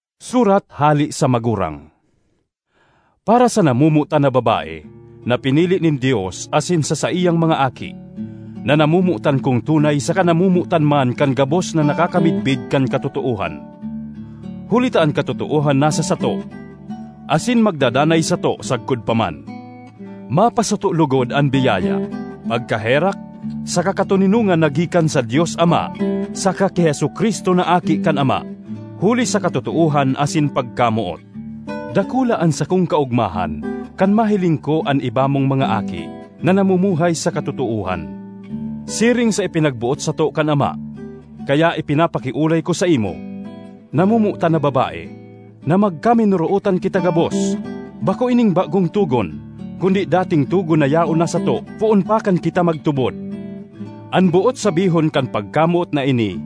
Surat hale sa Magurang—Para sa namomotan na Babae na pinili nin Dios asin sa saiyang mga aki, na namomotan kong tunay saka namomotan man kan gabos na nakakamidbid kan katotoohan, huli ta an katotoohan nasa sato asin magdadanay sato sagkod pa man. Mapasato logod an biyaya, pagkaherak saka katoninongan na gikan sa Dios Ama saka ki Jesu-Cristo na Aki kan Ama huli sa katotoohan asin pagkamoot. Dakula an sakong kaogmahan kan mahiling ko an iba mong mga aki na namumuhay sa katotoohan, siring sa ipinagboot sato kan Ama. Kaya ipinapakiolay ko saimo, namomotan na Babae, na magkaminorootan kita gabos. Bako ining bagong togon, kundi dating togon na yaon na sato poon pa kan kita magtubod. An boot sabihon kan pagkamoot na ini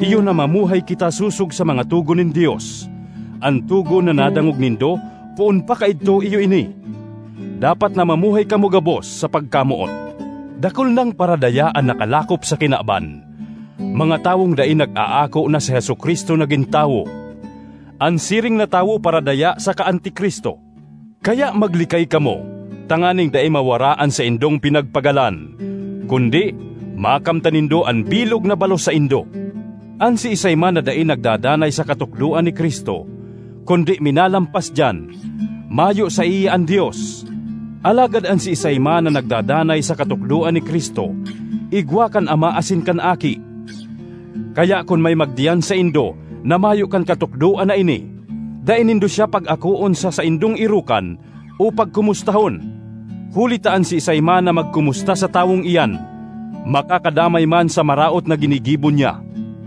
iyo na mamuhay kita sosog sa mga togon nin Dios. An togon na nadangog nindo poon pa kaidto iyo ini: dapat na mamuhay kamo gabos sa pagkamoot. Dakul nang paradaya an nakalakop sa kinaban, mga tawong dai nag-aako na si Jesu-Cristo nagin tawo. An siring na tawo paradaya daka (saka) Anti-Cristo. Kaya maglikay kamo, tanganing dai mawara an saindong pinagpagalan, kundi makamtan nindo an bilog na balos saindo. An siisay man na dai nagdadanay sa katukdoan ni Cristo kundi minalampas diyan, mayo saiya an Dios; alagad an siisay man na nagdadanay sa katukdoan ni Cristo igwa kan Ama asin kan Aki. Kaya kun may magdiyan saindo na mayo kan katukdoan na ini, dai nindo siya pag-akoon sa saindong erokan o pagkomustahon. Huli ta an siisay man na magkomusta sa tawong iyan makakadamay man sa maraot na ginigibo niya.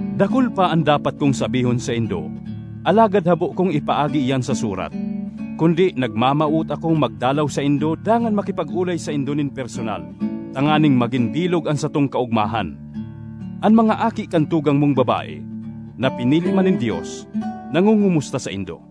Dakul pa an dapat kong sabihon saindo, alagad habo kong ipaagi iyan sa surat, kundi nagmamawot akong magdalaw saindo dangan makipag-olay saindo nin personal, tanganing magin bilog an satong kaogmahan. An mga aki kan Tugang mong Babae, na pinili man nin Dios, nangongomusta saindo.